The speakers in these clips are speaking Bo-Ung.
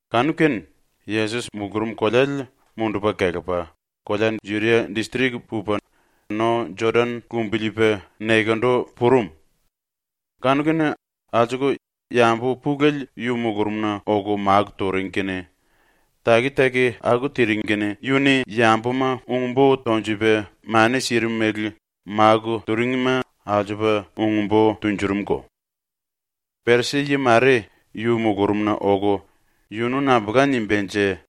Kanu-kene Yesos mulurum koleale mundupa kelepa kolea Judia distrik pupa no Jodan lumbiliipa nekendu purum. Kanu-kene alsuku yambu pulele yu mulurumna oku máku turing kene, taki-taki aku tiring kene yu-ni yambuma ung-bo tonjupa mani sirim mele máku turingima alsupa ung-bo tunjurumko. Perisi-yi mare yu mulurumna oku ‘Yunu nambulka nimbánje?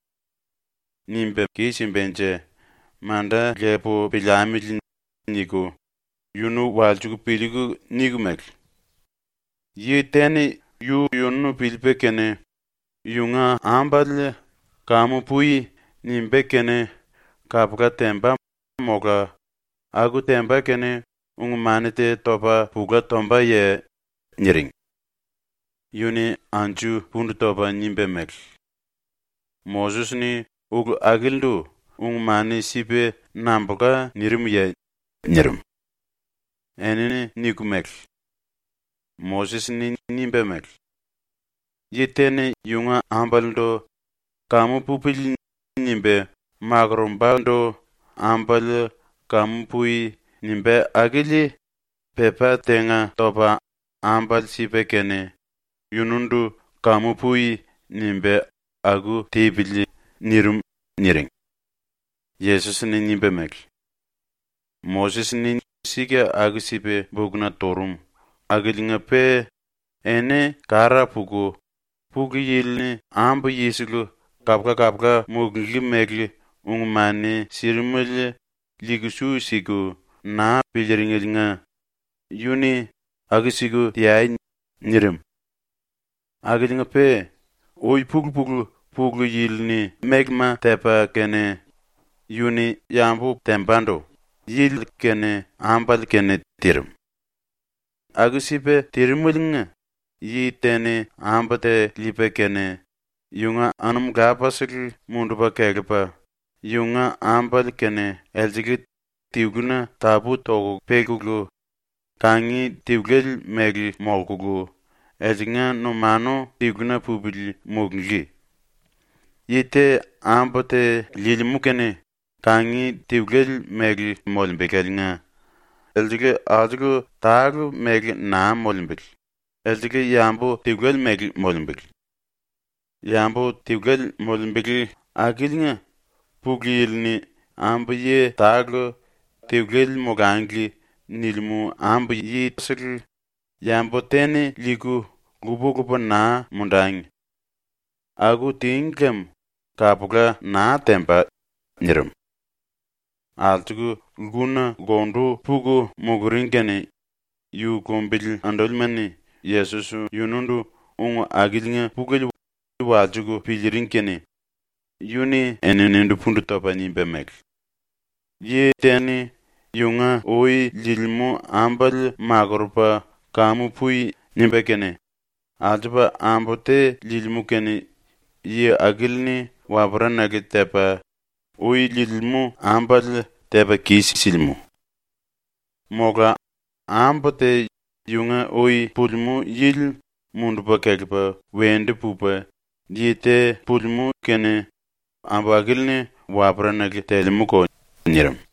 Nimba kis-simbanje manda lepu piliamili.’ niku yunu walsiku piliiku niku mele: “Yi te-ni yu-yunu piliipa kene yunga ambale “Kamu pui.” nimbá kene kapula temba mola aku temba kene ung-mani te topa pula tombaye?” niring. Yu-ni anju pundu topa nimba mele: “Moses-ni ulu akilindu ung-mani sipa nambulka nirimye?” nirim. Enini niku mele: “Moses-ni nimba mele: “Yi te-ni yunga ambalendu ‘Kamu pupili.’ nimba makorombandu ambale “Kamu pui.” nimbá akili pepá tenga topa ambale sipa kene yunundu “Kamu pui.” nimba aku tipili.” nirim.” niring. Yesos-ni nimba mele: “Moses-ni sika aku-sipa bukna turum akiliinga-pe eni kara puku Pulu Yili-ni ambu-yisele kapula-kapula mulunglí mele ung-mani sirimele liiku su siku naa piliiringeliinga yu-ni “Aku-siku teai.” nirim. Akiliinga-pe ui-pulu-pulu Pulu Yili-ni mélema tepa kene yu-ni yambu tembandu yili kene ambale kene tirim. ‘Aku-sipa tirimeliinga yi te-ni ambu te liipa kene yunga anum lapasele mundupa kelepa yunga ambale kene elsele tiluna tapú-toku pekulu, kangi tiluele mele ⸤molkulu elsengla numanu tiluna pupili⸥ mulunglí.’ Yi te ambu te liilimú kene kangi tiluele mele molembeláliinga elsele alsuku tale mele naa molembele, elsele yambu tiluele mele molembele. Yambu tiluele molembele akiliinga Pulu Yili-ni ambu-yi tale ‘Tiluele molangli.’ nilimú ambu-yisele yambu te-ni liiku lupa-lupa naa mundangi. Aku tíngi lem kapula naa temba.” nirim. Alsuku lkuna lkundu puku muluring kene yu lumbili andúlima-ni Yesos yunundu ung akiliinga pulele walsiku piliiring kene yu-ni eninindu pundu topa nimba mele: “Yi te-ni yunga ui liilimú ambale makurupa “Kamu pui.” nimba kene alsupa ambu te liilimú kene yi akili-ni waperanale tepa, ui liilimú ambale tepa kis-silimú. Mola ambu te yunga ui pulimú yili mundupa kelepa wendu pupa yi te pulimú kene ambu akili-ni waperanale telemúko.” nirim.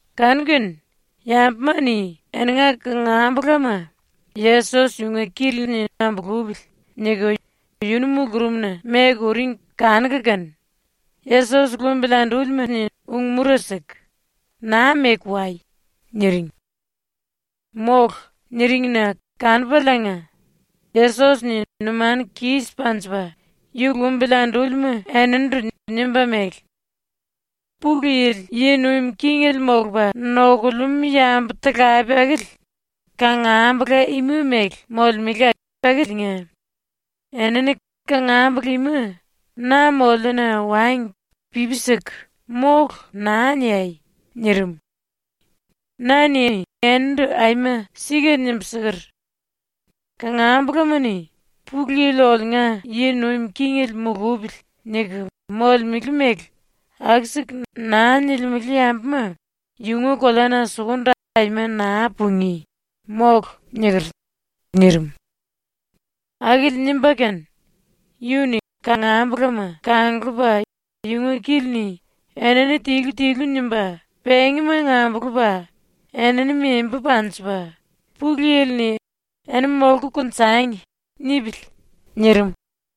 Kanu-kene yambuma-ni eninga kangambulama ‘Yesos yunga kili-ni ambulupili.’ niku yunu mulurumna meku uring kanuku kene Yesos lumbili andúlima-ni ung-mura siku ⸤“Naa meku wai!”⸥ niring. ⸤“Mólu.” niring-na⸥ kanupaliinga Yesos-ni numanu kis panjipa ⸤yu lumbili andúlima⸥ eninindu nimba mele: “Pulu Yili yi nuim kingele molupa nokulemú yambu-talape akili kangambula ima mele molemele akiliinga enini kangambula ima na moliuna wangi pipi siku “Mólu.” naa niai.” ⸤nirim.⸥ “Na-ni enindu aima sika nimbu siker: “Kangambolama-ni ‘Pulu Yili oliunga yi nuim kingele mulupili.’ niku molemele mele aku-siku naa nilimele yambuma yunga koleana sukundu aima naa pungí, mólu.” niker.” nirim. Akili nimba kene yu-ni kangambulama kanglupa yunga kili-ni enini tilu-tilu nimba pengimanga ambulupa enini membu panjipa “Pulu Yili-ni “Eni molku konjangi.” nipili.” nirim.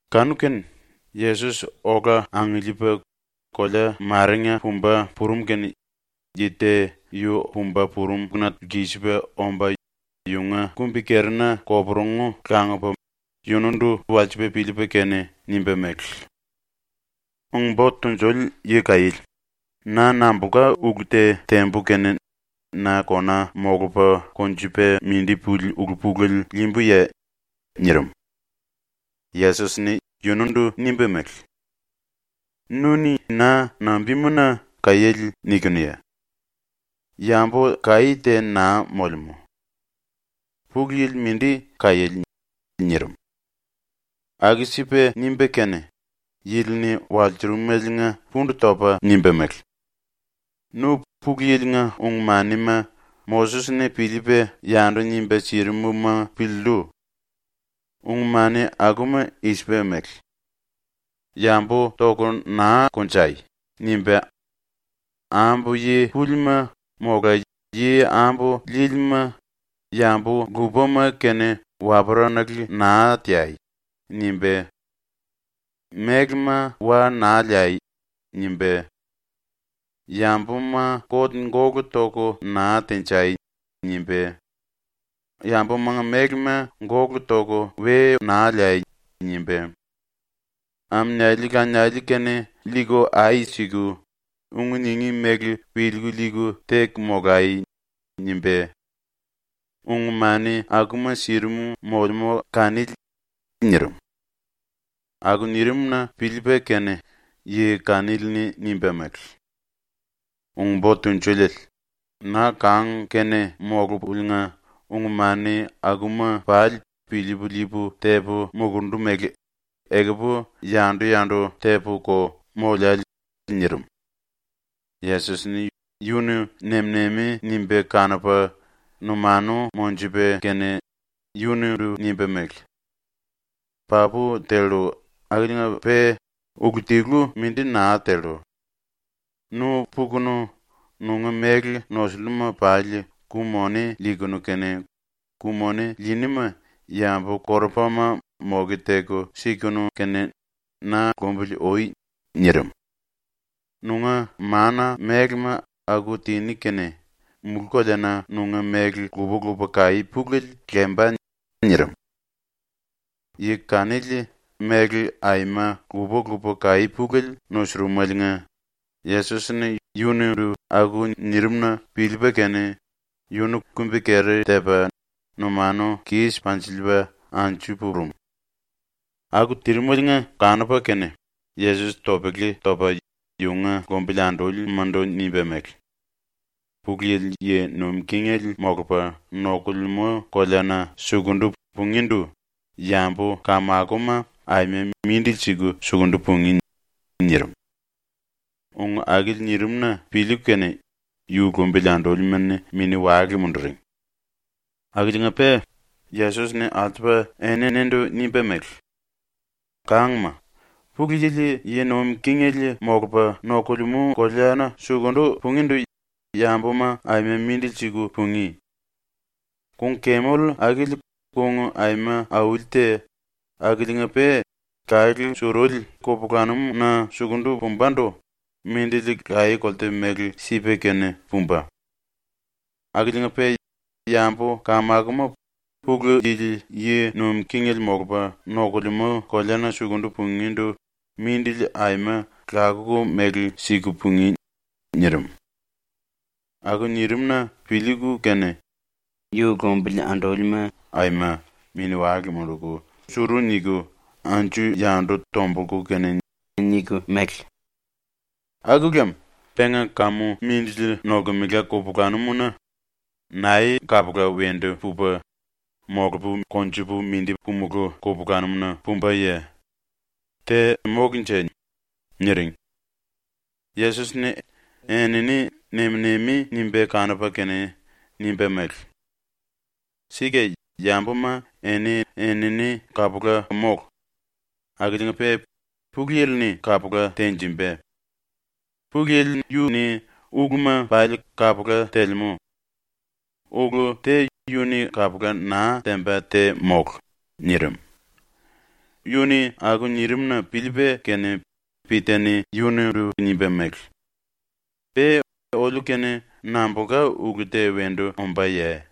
Kanu-kene Yesos ola angiliipa kolea marenga pumba purum kene yi te yu pumba purumna lkisipa omba yunga kumbi-kerina koporungu langupa yunundu walsipa piliipa kene nimba mele: “Ung-Bo Tunjuliele Yi-Kaiéle, na nambulka ulu te tembu kene na kona molupa konjupa mindi puli ulu-pulele liimbuye?” nirim. Yesos-ni yunundu nimba mele: “Nu-ni na nambimuna “Kaiéle” nikinuye? Yambu kaí te naa molemú. Pulu Yili mindi kaiéle.” nirim. ⸤Aku-sipa nimba kene yili-ni walsurumeliinga pundu topa nimba mele:⸥ “Nu ⸤Pulu Yili-nga⸥ ung-manima ⸤Moses-ni piliipa yandu nimba sirim-ma⸥ piliillu. ⸤Ung-mani akuma i-sipa mele⸥: “Yambu toku naa konjai.” nimba, “Ambu yi púlima mola yi ambu líílima yambu lupama kene waperanale naa teai.” nimba, “Mélema wa naa liai.” nimba, “Yambuma kot gólu toku naa tenjai.” nimba, “Yambumanga mélema gólu toku we naa liai.” nimba, “Aminiali-laniali-kene liiku ai siku, ung ningí mele piliiku liiku teku molai.” nimba, ung-mani akuma sirim molemú kanili.” nirim. Aku nirim-na piliipa kene yi kanili-ni nimba mele: “Ung-Bo Tunjuliele, na kang-kene molupuliinga ung-mani akuma pali piliipu liipu tepu mulurundu mele ekupu yandu-yandu tepu-ko moliále.” nirim. Yesos-ni yunu nem-nemi nimba kanupa numanu monjupa kene yunundu nimba mele: “Papu tellu akiliinga-pe ulu tilu mindi naa tellu. Nu pukunu nunga méle nosulluma pali ku-moni liikunu kene, ku-moni liiníma yambu-korupama moke teku sikunu kene na lumbili ui.” nirim. “Nunga ⸤mána-⸥mélema aku tiní kene mulú-koleana nunga méle lupa-lupa kaí pulele lemba.” nirim. Yi kanili méle aima lupa-lupa kaí pulele nusurumeliinga Yesos-ni yunundu aku nirim-na piliipa kene yunu kumbi-keri tepa numanu kis panjilsiliipa anju purum. ⸤Aku tirimeliinga kanupa kene⸥ Yesos topele topa yunga lumbili andúlimandu nimba mele: “Pulu Yili yi nuim kingele molupa nokulemú koleana sukundu pungíndu yambu-kamakoma aima mindili siku sukundu pungí.” nirim. Ung akili nirin⸤-na piliiku kene⸥ yu lumbili andúlima-ni mini-wale munduring. Akiliinga-pe Yesos-ni alsupa eninindu nimba mele: “Kangma, Pulu Yili yi nuim kingele molupa nokulemú koleana sukundu pungíndu yambuma aima mindili siku pungí. Kung-kemel akili ⸤kung aima auli te akiliinga-pe⸥ kalé suruli kupulanum-na sukundu pumbandu mindili laye-kolte mele sipa kene pumba. Akiliinga-pe yambu-kamakoma Pulu Yili yi nuim kingele molupa nokulemú koleana sukundu pungíndu mindili aima lakuku mele siku pungí.” nirim. ⸤Aku nirim-na piliiku kene⸥ yu lumbili andúlima aima mini-wale munduku suru niku anju-yandu tombulku kene niku mele: “Aku lem penga kamu mindili nolkemela kupulanum-na nae kapula wendu pupa, molupu konjupu mindi pumulú kupulanum-na pumbaye? Te mólunje?” niring. Yesos-ni enini nem-nemi nimba kanupa kene nimba mele: “Sika yambuma eni-enini kapula mólu, akiliinga-pe Pulu Yili-ni kapula tenjimba. Pulu Yili yu-ni uluma pali kapula telemú. Ulu te yu-ni kapula naa temba te mólu.” nirim. Yu-ni aku nirim-na piliipa kene Pita-ni yunundu nimba mele: “⸤Pe oliu-kene nambulka ulu te wendu ombáye?⸥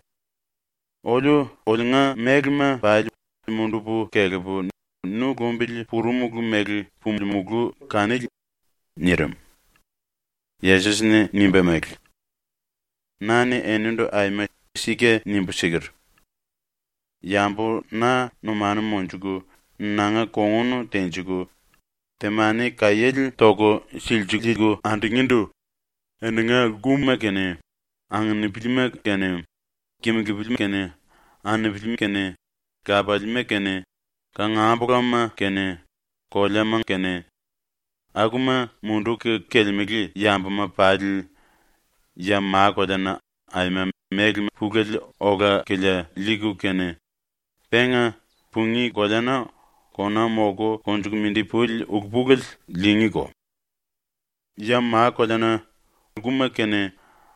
Oliu oliunga mélema pali mundupu kelepu nu lumbili purumulu mele pulimulu kanili.” nirim. Yesos-ni nimba mele: “Na-ni enindu aima sika nimbu siker: “Yambu na numanu monjuku nanga kongun tenjiku temani-kaiéle toku silsiliiku andungíndu eninga lkuma kene, anginipilima kene, kimulupili kene, anupili kene, lapaliima kene kangambulama kene, koleama kene, akuma munduku kelemele yambuma pali ya ma-koleana aima méle pulele ola-kilia liiku kene, penga pungí koleana kona molku konjuku mindi puli ulu-pulele liingíko. Ya ma-koleana lkuma kene,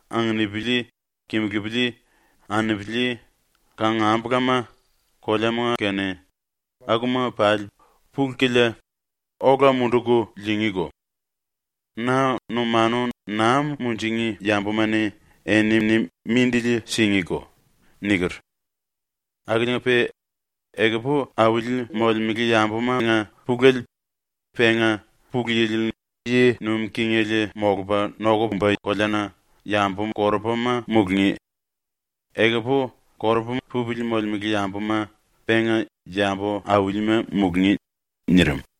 anginipili, kimulupili, anupili, kangambulama, koleama kene, akuma pali pulu-kilia ola munduku liingíko; ⸤na numanu naa munjingí yambuma-ni⸥ enini mindili singíko.” niker. Akiliinga-pe ekupu auli molemele yambumanga pulele penga ⸤Pulu Yili yi nuim kingele molupa nokumba koleana⸥ yambu-korupama mulungí; ekupu korupa pupili molemele yambuma penga yambu-aulima mulungí.” nirim.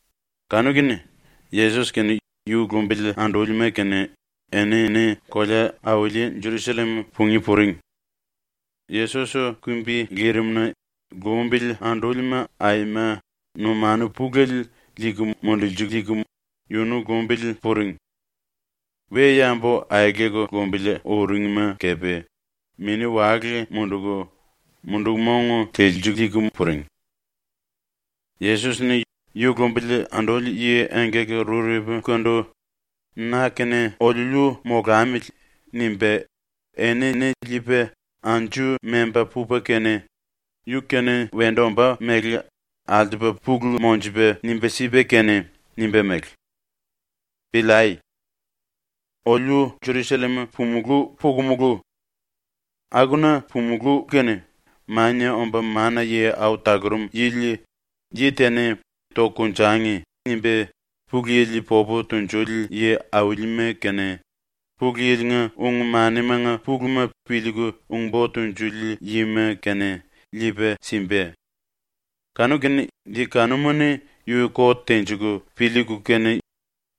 Kanu-kene ⸤Yesos kene yu lumbili andúlima kene⸥ enini kolea-auli Jerusallem pungí puring. Yesos kumbi lirimna lumbili andúlima aima numanu pulele liiku mundulsiliiku yunu lumbili puring. We-yambu aeleku lumbili uringma kepe mini-wale munduku mundu-mong telsiliiku puring. Yesos-ni ⸤yu lumbili anduli⸥ yi engkaki-rurepukandu ‘na kene oliuliu molamili.’ nimba enini liipa anju memba pupa kene, yu-kene wendu ombá mele alsupa pulu monjupa nimba sipa kene nimba mele: “Piliai. Oliu Jerusallem pumulú pukumulu. Akuna pumulú kene Mania Omba Mana-Yi Au Talurum Yili yi te-ni ‘Tangi.’ nimba Pulu Yili popu tunjuli yi-aulima kene, Pulu Yili-nga ung-manimanga puluma piliiku ung-bo tunjuli yima kene, liipa simba. Yi kanuma-ni yu kot tenjiku piliiku kene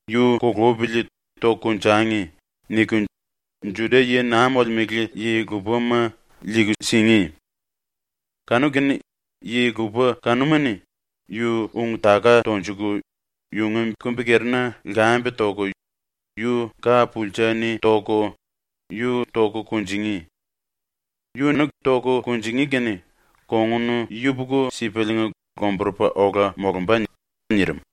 ‘Yu kulupili toku konjangi.’ niku Juda-yi naa molemele yi-lupama liiku singí. Kanu-kene yi-lupa kanuma-ni yu ung-taka tonjuku yunga kumbi-kerina lkambe toku yu ka-pulsa-ni toku yu toku kunjingí. Yunu toku kunjingí kene kongun yupuku-sipaliinga lomburupa ola molumba.” nirim.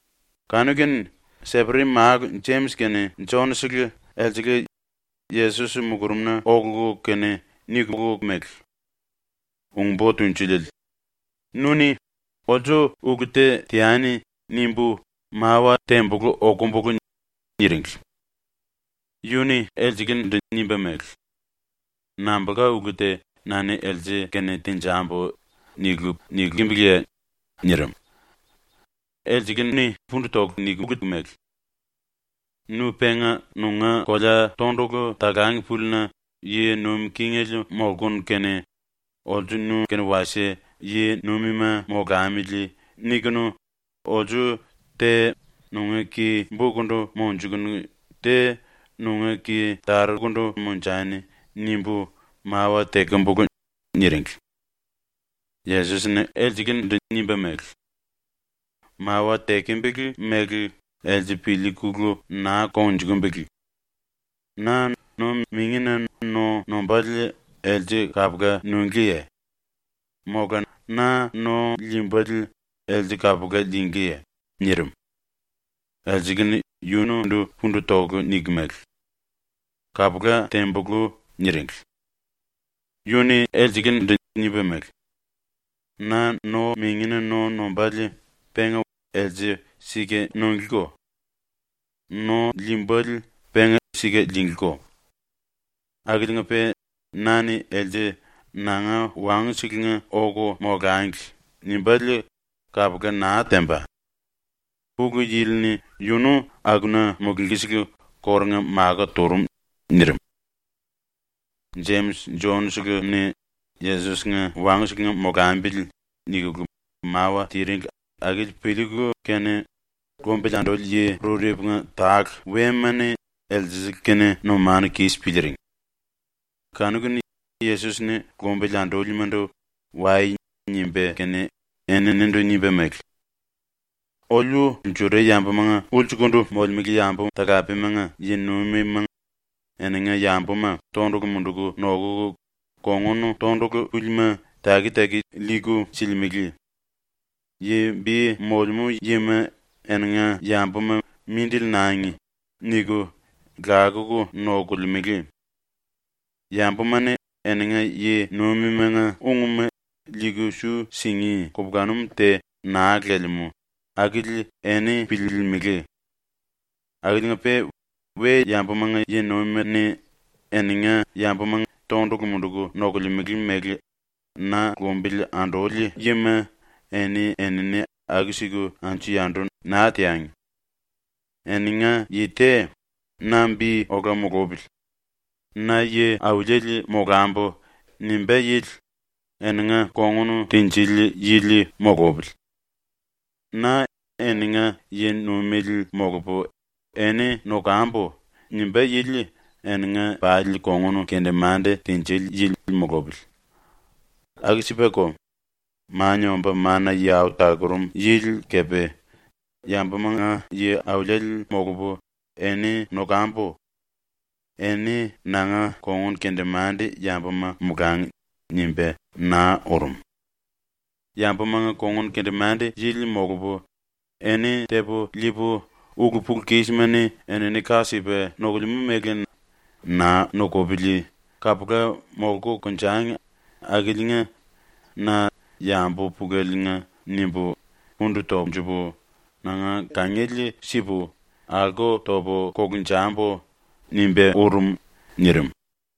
Kanu-kene Seperi-málu Jemis kene Jon-sele elsele Yesos mulurumna okulu kene nikulu mele: “Ung-Bo Tunjuliele, nu-ni ‘Olsu ulu te teani.’ nimbu mawa tembulú okumbulu.” niringli. Yu-ni elselendu nimba mele: “Nambulka ulu te ‘na-ni else-kene tenjambu.’ niku nikimbiliye?” nirim. Elsele-ni pundu toku nikulu mele: “Nu penga nunga kolea tondulu talang púlina ⸤yi nuim kingele molkunu kene, ‘olsu nu-kene wasie yi-nuimima molamili.’ nikunu⸥ ‘olsu te nunga ki-bokundu monjukunu te nunga ki-tarukundu monjani.’ nimbu mawa tekembulu.” niringli. Yesos-ni elselendu nimba mele: “Mawa tekembele mele else piliikulu naa kongnjukumbele. Na no-mingina no nombále else kapula nunglíye? Mola na no liimbále else kapula liingíye?” nirim. Elsele-ni yunundu pundu toku nikulu mele: “Kapula tembulú.” niringli. Yu-ni elselendu nimba mele: “Na no-mingina no nombále penga else sika nunglíko. No liimbále penga sika liinglíko. Akiliinga-pe na-ni else “Nanga wangu-selenga oku molangli.” nimbále kapula naa temba. ⸤Pulu Yili-ni yunu⸥ akuna mulunglí-sele kórunga makó turum.” nirim. Jemis Jon-seleni ⸤‘Yesos-nga wangu-selenga molambili.’⸥ nikulu mawa tiringli akili piliiku kene lumbili anduli yi rurepunga tale wema-ni elsele-kene numanu kis piliiring. Kanu-kene Yesos-ni lombili andúlimandu “Wai.” nimba kene, eninindu nimba mele: “Oliu Juda-yambumanga ulsukundu molemele yambu-talapemanga yi-nuimima eninga yambuma tondulu munduku nokuku kongun tondulu púlima taki-taki liiku silimele. Yi bi molemú yima eninga yambuma ‘Mindili nangi.’ niku lakuku nokolemele. ⸤Yambuma-ni eninga yi-nuimimanga ungma liiku su singí kupulanum te naa lelemú akili⸥ eni piliilimili. Akiliinga-pe ⸤we-yambumanga yi-nuimima-ni eninga yambuma tondulu munduku nokolemele mele na lumbili anduli yima⸥ eni-enini aku-siku anju-yandu naa teangi. Eninga yi te ‘Na bi ola mulupili. Na yi-auliele molambu.’ nimbá yili eninga kongun tinjili yili mulupili. ‘Na eninga yi-nuimele molupu eni nokambu.’ nimbá yili eninga pali kongun kendemande tinjili yili mulupili. Aku-sipako, Mania Omba Mana-Yi Au Talurum Yili kepe ‘Yambumanga yi-auliele molupu eni nokambu. Eni nanga kongun-kendemande-yambuma molangi.’ nimba naa urum. ‘Yambumanga kongun-kendemande-yili molupu, eni tepu liipu, ulu-pulu-kismani enini ka sipa nokulemú mele naa nokopili kapula molku konjangi akiliinga na yambu puleliinga nimbu pundu tonjupu nanga kangiele sipu, alko topu kolunjambu.’ nimba urum.” nirim.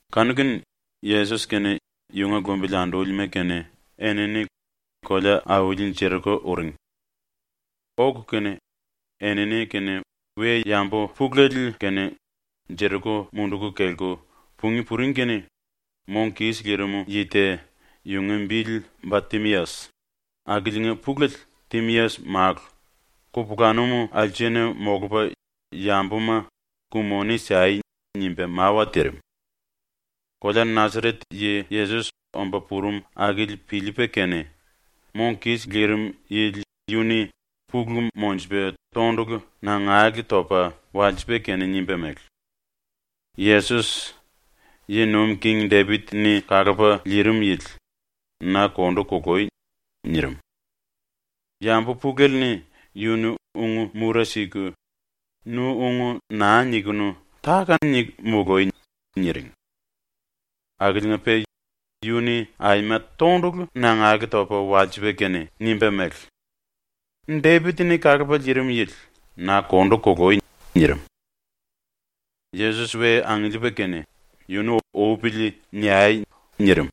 Kanu-kene Yesos kene yunga lumbili andúlima kene enini kolea-auli Jeriko uring. Oku kene enini kene we-yambu pulele kene Jeriko munduku kelku pungí puring kene mong kis lirim yi te, yunga bili Ba-Timias, (akiliinga pulele Timias-málu), kupulanum alsena molupa yambuma “Ku-moni sai.” nimba mawa tirim. Kolea Nasaret yi Yesos omba purum akili piliipa kene mong kis lirim yili yu-ni pulu monjupa tondulu nangale topa walsipa kene nimba mele: “Yesos, ⸤yi nuim king⸥ Depit-ni kalupa liirim yili, na kondu kului!” nirim. Yambu pulele-ni yunu ung-mura siku “Nu ung naa nikunu táka-niku mului!” niring. Akiliinga-pe yu-ni aima tondulu nangale topa walsipa kene nimba mele: “Depit-ni kalupa liirim yili, na kondu kului!” nirim. Yesos we angiliipa kene “Yunu upili niai.” nirim.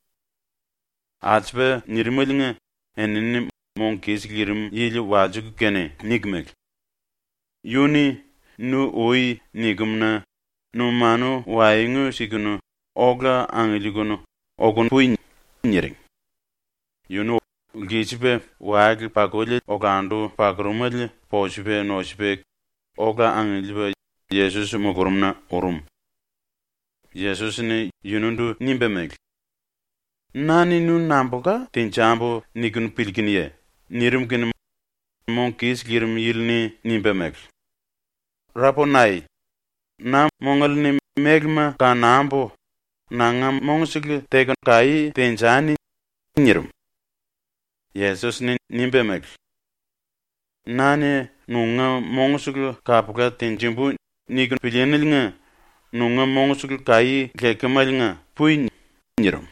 Aku-sipa nirimeliinga enini mong kis lirim yili walsiku kene niku mele: “Yu-ni “Nu ui.” nikem-na numanu waengu sikunu ola angiliikunu oku pui.” niring. Yunu lkisipa wale-pakuli olandu pakurumele posupa nosupa ola angiliipa Yesos mulurumna urum. Yesos-ni yunundu nimba mele: “Na-ni nu nambulka tenjambu niku piliikunuye?” nirim kene mong kis lirim yili-ni nimba mele: “Raponai, na mongale-ni mélema kanambu nanga mongsele teku kaí tenjani.” nirim. Yesos-ni nimba mele: “‘Na-ni nunga mongsele kapula tenjimbu.’ niku pilííneliinga nunga mongsele kaí lekemeliinga pui.” nirim.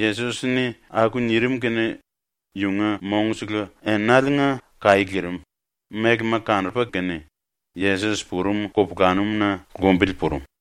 Yesos-ni aku nirim kene yunga mongsele enaliinga kaí lirim, mélema kanupa kene, Yesos purum kupulanum-na lumbili purum.